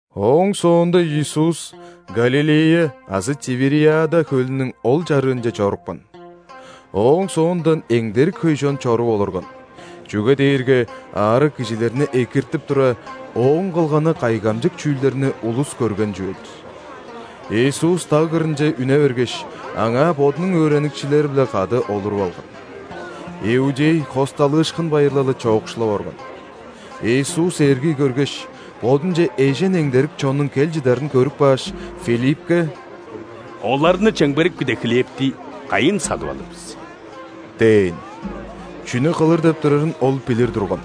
Ооң соонда Иисус Галилея (азы Тивериада) хөлүнүң ол чарыынче чорупкан. Ооң соондан эңдерик хөй чон чоруп олурган, чүге дээрге аарыг кижилерни экиртип тура, Ооң кылганы кайгамчык чүүлдерни улус көрген чүве-дир. Иисус даг кырынче үне бергеш, аңаа Бодунуң өөреникчилери-биле кады олуруп алган. Иудей ·Хосталыышкын байырлалы чоокшулап орган. Иисус эргий көргеш, Бодунче эжен-эңдерик чоннуң кел чыдарын көрүп кааш, Филиппке: «Оларны чемгерипки дег хлебти кайыын садып алыр бис?» – дээн. Чүнү кылыр деп турарын Ол билир турган,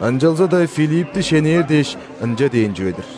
ынчалза-даа Филиппти шенээр дээш, ынча дээн чүве-дир.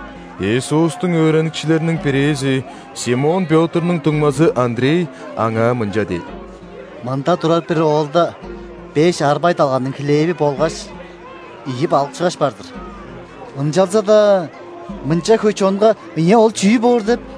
Иисустуң өөреникчилериниң бирээзи – Симон Пётрнуң дуңмазы Андрей Аңаа мынча дээн: «Мында турар бир оолда беш арбай далганының хлеви болгаш ийи балыкчыгаш бар-дыр. Ынчалза-даа мынча хөй чонга ыя ол чүү боор деп?»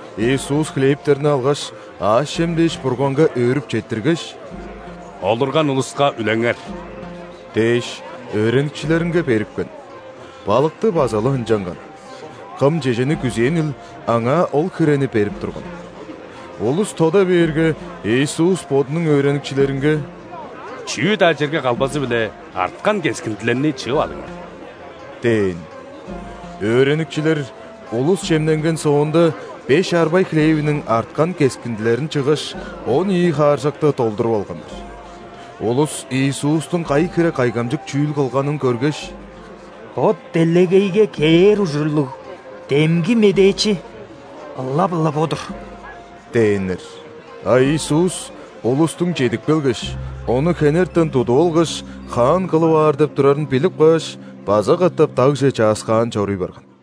Иисус хлебтерни алгаш, аъш-чем дээш, Бурганга өөрүп четтиргеш: «Олурган улуска үлеңер» – дээш, өөреникчилеринге берипкен. Балыкты база-ла ынчанган. Кым чежени күзээнил, аңаа ол хирени берип турган. Улус тода бээрге, Иисус Бодунуң өөреникчилеринге: «Чүү-даа черге калбазы-биле, арткан кескиндилерни чыып алыңар» – дээн. Өөреникчилер улус чемненген соонда беш арбай хлевиниң арткан кескиндилерин чыггаш, он ийи хааржакты долдуруп алганнар. Улус Иисустуң кайы хире кайгамчык чүүл кылганын көргеш: «Бо делегейге кээр ужурлуг демги Медээчи ылап-ла бо-дур!» – дээннер. А Иисус улустуң чедип келгеш, Ону хенертен тудуп алгаш, хаан кылып аар деп турарын билип кааш, база катап дагже чааскаан чоруй барган.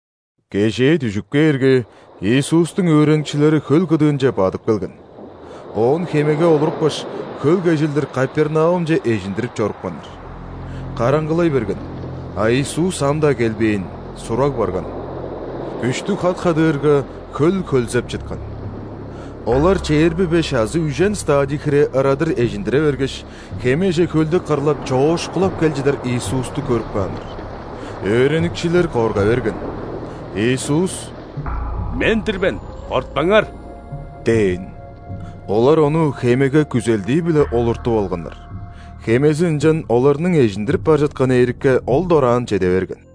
Кежээ дүжүп кээрге, Иисустуң өөреникчилери хөл кыдыынче бадып келген. Оон хемеге олурупкаш, хөл кежилдир Капернаумче эжиндирип чорупканнар. Караңгылай берген, а Иисус ам-даа келбээн, сураг барган. Күштүг хат хадыырга, хөл хөлзеп чыткан. Олар чээрби беш азы үжен °стадий хире ырадыр эжиндире бергеш, хемеже хөлдү кырлап чоокшулап кел чыдар Иисусту көрүп кааннар. Өөреникчилер корга берген. Иисус: «Мен-дир мен, кортпаңар!» – дээн. Олар Ону хемеге күзелдии-биле олуртуп алганнар, хемези ынчан оларның эжиндирип бар чытканы эрикке ол дораан чеде берген.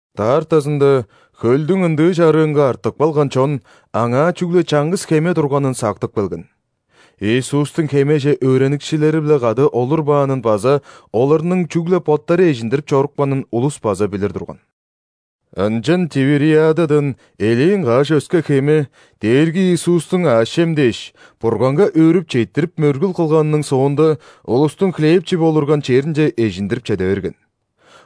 Даартазында хөлдүң ындыы чарыынга артып калган чон аңаа чүгле чаңгыс хеме турганын сактып келген. Иисустуң хемеже өөреникчилери-биле кады олурбаанын база оларның чүгле боттары эжиндирип чорупканын улус база билир турган. Ынчан Тивериададан элээн каш өске хеме Дээрги Иисустуң аъш-чем дээш, Бурганга өөрүп четтирип мөргүл кылганының соонда, улустуң хлеб чип олурган черинче эжиндирип чеде берген.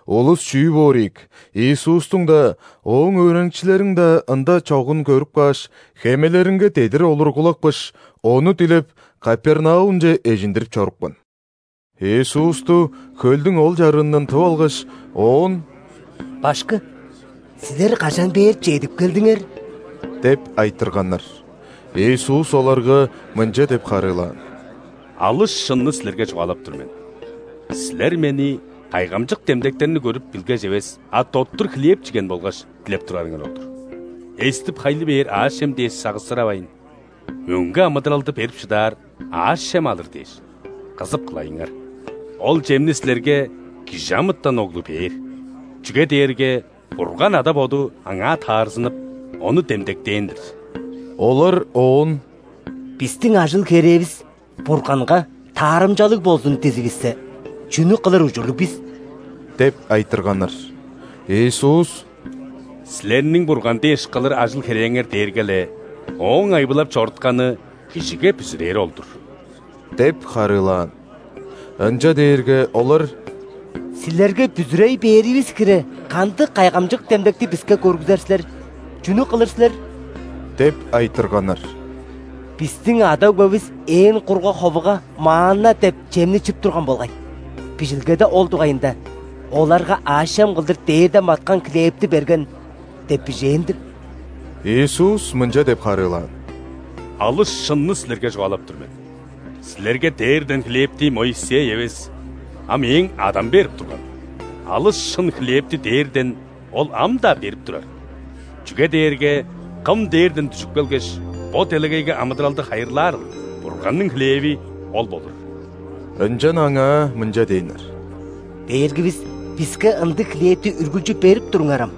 Улус чүү боор ийик, Иисустуң-даа, Ооң өөреникчилериниң-даа ында чогун көрүп кааш, хемелеринге дедир олургулапкаш, Ону дилеп, Капернаумче эжиндирип чорупкан. Иисусту хөлдүң ол чарыындан тып алгаш, Оон: «Башкы, Силер кажан бээр чедип келдиңер?» – деп айтырганнар. Иисус оларга мынча деп харыылаан: «Алыс шынны силерге чугаалап тур мен: силер Мени кайгамчык демдектерни көрүп, билгеш эвес, а тоттур хлеб чиген болгаш, дилеп турарыңар ол-дур! Эстип-хайлы бээр аъш-чем дээш сагышсыравайн, мөңге амыдыралды берип шыдаар аъш-чем алыр дээш, кызып-кылайыңар. Ол чемни силерге ·Кижи амытан Оглу бээр, чүге дээрге Бурган Ада Боду Аңаа таарзынып, Ону демдектээн-дир». Олар Оон: «Бистиң ажыл-херээвис Бурганга таарымчалыг болзун дизивиссе, чүнү кылыр ужурлуг бис?» – деп айтырганнар. Иисус: «Силерниң Бурган дээш кылыр ажыл-херээңер дээрге-ле Ооң айбылап чорутканы Кижиге бүзүрээри ол-дур» – деп харыылаан. Ынча дээрге, олар: «Силерге бүзүрей бээривис хире кандыг кайгамчык демдекти биске көргүзер силер? Чүнү кылыр силер? – деп айтырганнар. – Бистиң ада-өгбевис ээн кургаг ховуга манна деп чемни чип турган болгай. Бижилгеде ол дугайында: „Оларга аъш-чем кылдыр дээрден баткан хлебти берген“ – деп бижээн-дир». Иисус мынча деп харыылаан: «Алыс шынны силерге чугаалап тур мен: силерге дээрден хлебти Моисей эвес, а Мээң Адам берип турган, алыс шын хлебти дээрден Ол ам-даа берип турар. Чүге дээрге Кым дээрден дүжүп келгеш, бо делегейге амыдыралды хайырлаарыл, Бурганның хлеви Ол болур». Ынчан Аңаа мынча дээннер: «Дээргивис, биске ындыг хлебти үргүлчү берип туруңарам».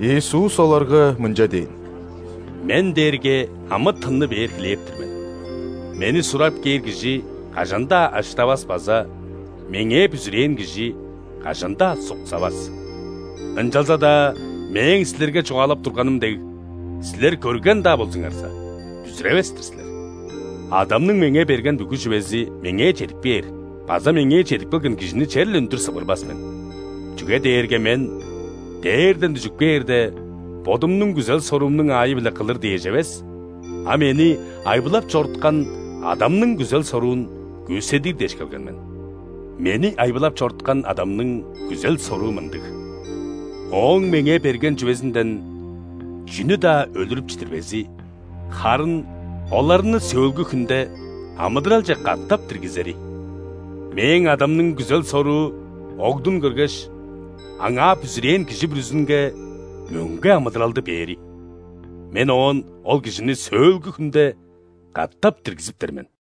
Иисус оларга мынча дээн: «Мен дээрге амы-тынны бээр хлеб-тир мен. Мени сурап кээр кижи кажан-даа аштавас база Меңээ бүзүрээн кижи кажан-даа суксавас. Ынчалза-даа Мээң силерге чугаалап турганым дег, силер көрген-даа болзуңарза, бүзүревес-тир силер! Адамның Меңээ берген бүгү чүвези Меңээ чедип кээр база Меңээ чедип келген кижини черле үндүр сывырбас мен. Чүге дээрге Мен, дээрден дүжүп кээрде, Бодумнуң күзел-соруумнуң аайы-биле кылыр дээш эвес, а Мени айбылап чоруткан Адамның күзел-соруун күүседир дээш келген мен. Мени айбылап чоруткан Адамның күзел-соруу мындыг: Ооң Меңээ берген чүвезинден чүнү-даа өлүрүп-чидирбези, харын оларны сөөлгү хүнде амыдыралче катап диргизери. Мээң Адамның күзел-соруу – Оглун көргеш, Аңаа бүзүрээн кижи бүрүзүнге мөңге амыдыралды бээри. Мен оон ол кижини сөөлгү хүнде катап диргизиптер мен».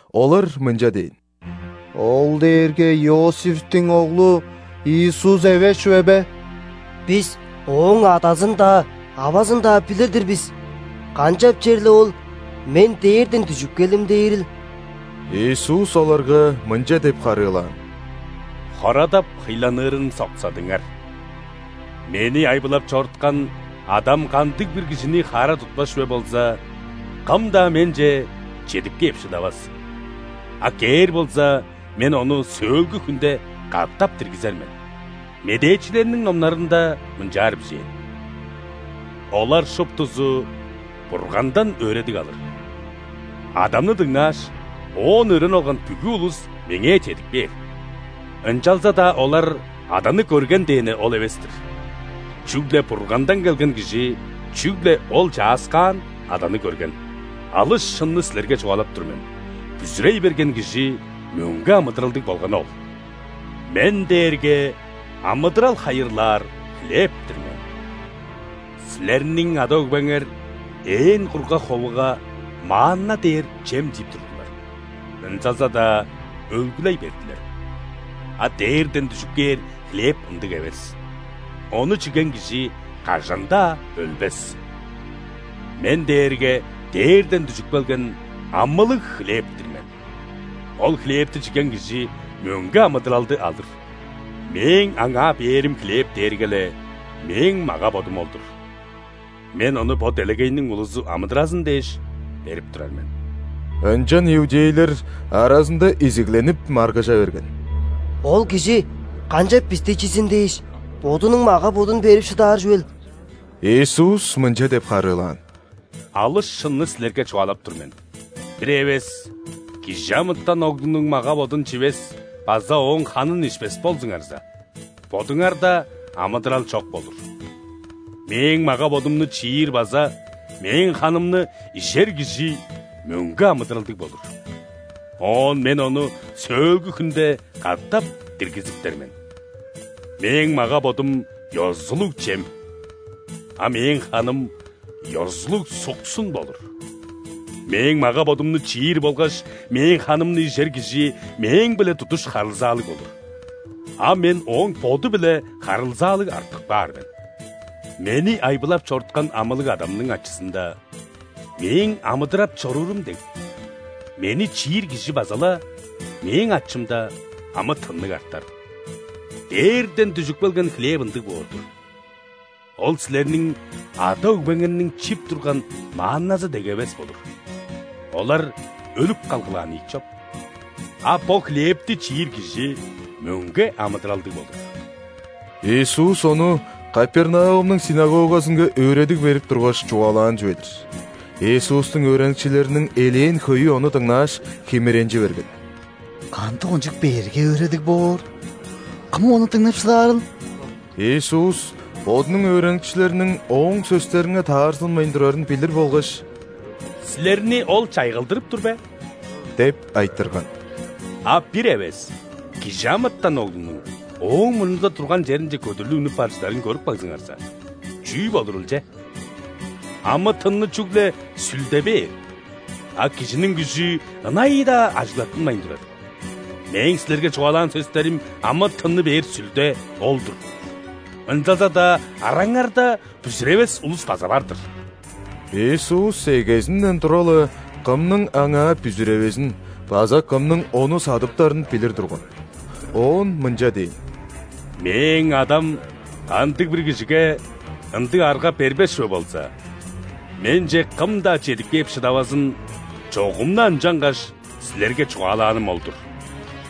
Олар мынча дээн: «Ол дээрге Иосифтиң оглу Иисус эвес чүве бе? Бис Ооң адазын-даа, авазын-даа билир-дир бис. Канчап черле Ол: „Мен дээрден дүжүп келдим“ – дээрил?» Иисус оларга мынча деп харыылаан: «Хорадап, хыйланырын соксадыңар. Мени айбылап чоруткан Адам кандыг-бир кижини хаара тутпас чүве болза, кым-даа Менче чедип кээп шыдавас. А кээр болза, Мен ону сөөлгү хүнде катап диргизер мен. Медээчилерниң номнарында мынчаар бижээн: „Олар шуптузу Бургандан өөредиг алыр“. Адамны дыңнааш, Оон өөренип алган бүгү улус Меңээ чедип кээр. Ынчалза-даа олар Аданы көрген дээни ол эвес-тир. Чүгле Бургандан келген Кижи, чүгле Ол чааскаан, Аданы көрген. Алыс шынны силерге чугаалап тур мен: бүзүрей берген кижи мөңге амыдыралдыг болганы ол. Мен дээрге амыдырал хайырлаар хлеб-тир мен. Силерниң ада-өгбеңер ээн кургаг ховуга манна дээр чем чип турдулар, ынчалза-даа өлгүлей бердилер. А дээрден дүжүп кээр хлеб ындыг эвес: ону чиген кижи кажан-даа өлбес. Мен дээрге дээрден дүжүп келген, амылыг хлеб-тир мен. Ол хлебти чиген кижи мөңге амыдыралды алыр. Мээң аңаа бээрим хлеб дээрге-ле Мээң мага-бодум ол-дур. Мен ону бо делегейниң улузу амыдыразын дээш, берип турар мен». Ынчан иудейлер аразында изигленип маргыжа берген: «Ол Кижи канчап бисти чизин дээш, бодунуң мага-бодун берип шыдаар чүвел?» Иисус мынча деп харыылаан: «Алыс шынны силерге чугаалап тур мен: бир эвес ·Кижи амытан Оглунуң мага-бодун чивес база Ооң ханын ишпес болзуңарза, бодуңарда амыдырал чок болур. Мээң мага-бодумну чиир база Мээң ханымны ижер кижи мөңге амыдыралдыг болур, оон Мен ону сөөлгү хүнде катап диргизиптер мен. Мээң мага-бодум – ёзулуг чем, а Мээң ханым – ёзулуг суксун болур. Мээң мага-бодумну чиир болгаш Мээң ханымны ижер кижи Мээң-биле тудуш харылзаалыг болур, а Мен ооң боду-биле харылзаалыг артып каар мен. Мени айбылап чоруткан амылыг Адамның ачызында Мээң амыдырап чоруурум дег, Мени чиир кижи база-ла Мээң ачымда амы-тынныг артар. Дээрден дүжүп келген хлеб ындыг боор-дур. Ол силерниң ада-өгбеңерниң чип турган манназы дег эвес болур – олар өлүп калгылаан ийик чоп. А бо хлебти чиир кижи мөңге амыдыралдыг болур». Иисус ону Капернаумнуң ·синагогазынга өөредиг берип тургаш, чугаалаан чүве-дир. Иисустуң өөреникчилериниң элээн хөйү ону дыңнааш, химиренчи берген: «Кандыг кончуг берге өөредиг боор! Кым ону дыңнап шыдаарыл?» Иисус Бодунуң өөреникчилериниң Ооң сөстеринге таарзынмайн турарын билир болгаш: «Силерни ол чайгылдырып тур бе? – деп айтырган. – А бир эвес ·Кижи амытан Оглунуң ооң мурнунда турган черинче көдүрлүп үнүп бар чыдарын көрүп кагзыңарза, чүү болурул че? Амы-тынны чүгле Сүлде бээр, а кижиниң күжү ынай-даа ажыглаттынмайн турар. Мээң силерге чугаалаан сөстерим – амы-тынны бээр Сүлде ол-дур. Ынчалза-даа араңарда бүзүревес улус база бар-дыр». Иисус эгезинден тура-ла, кымның Аңаа бүзүревезин база кымның Ону садыптарын билир турган. Оон мынча дээн: «Мээң Адам кандыг-бир кижиге ындыг арга бербес чүве болза, Менче кым-даа чедип кээп шыдавазын чогум-на ынчангаш силерге чугаалааным ол-дур».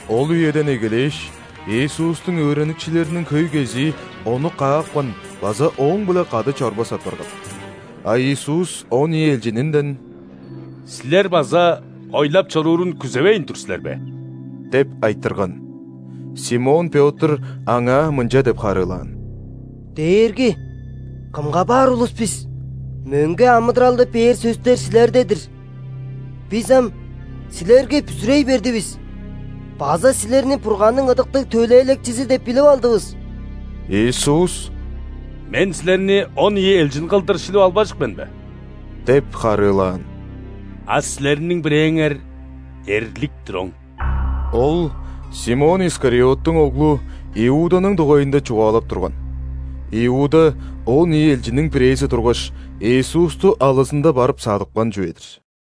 Ол үеден эгелээш, Иисустуң өөреникчилериниң хөй кезии Ону каапкан база Ооң-биле кады чорбас апарган. А Иисус он ийи элчининден: «Силер база ойлап чоруурун күзевейн-дир силер бе?» – деп айтырган. Симон Пётр Аңаа мынча деп харыылаан: «Дээрги, кымга баар улус бис? Мөңге амыдыралды бээр сөстер Силерде-дир. Бис ам Силерге бүзүрей бердивис база Силерни Бурганның Ыдыктыг Төлээлекчизи деп билип алдывыс». Иисус: «Мен силерни он ийи элчин кылдыр шилип албажык мен бе? – деп харыылаан. – А силерниң бирээңер эрлик-тир оң!» Ол Симон Искариоттуң оглу Иуданың дугайында чугаалап турган. Иуда, он ийи элчинниң бирээзи тургаш, Иисусту алызында барып садыпкан чүве-дир.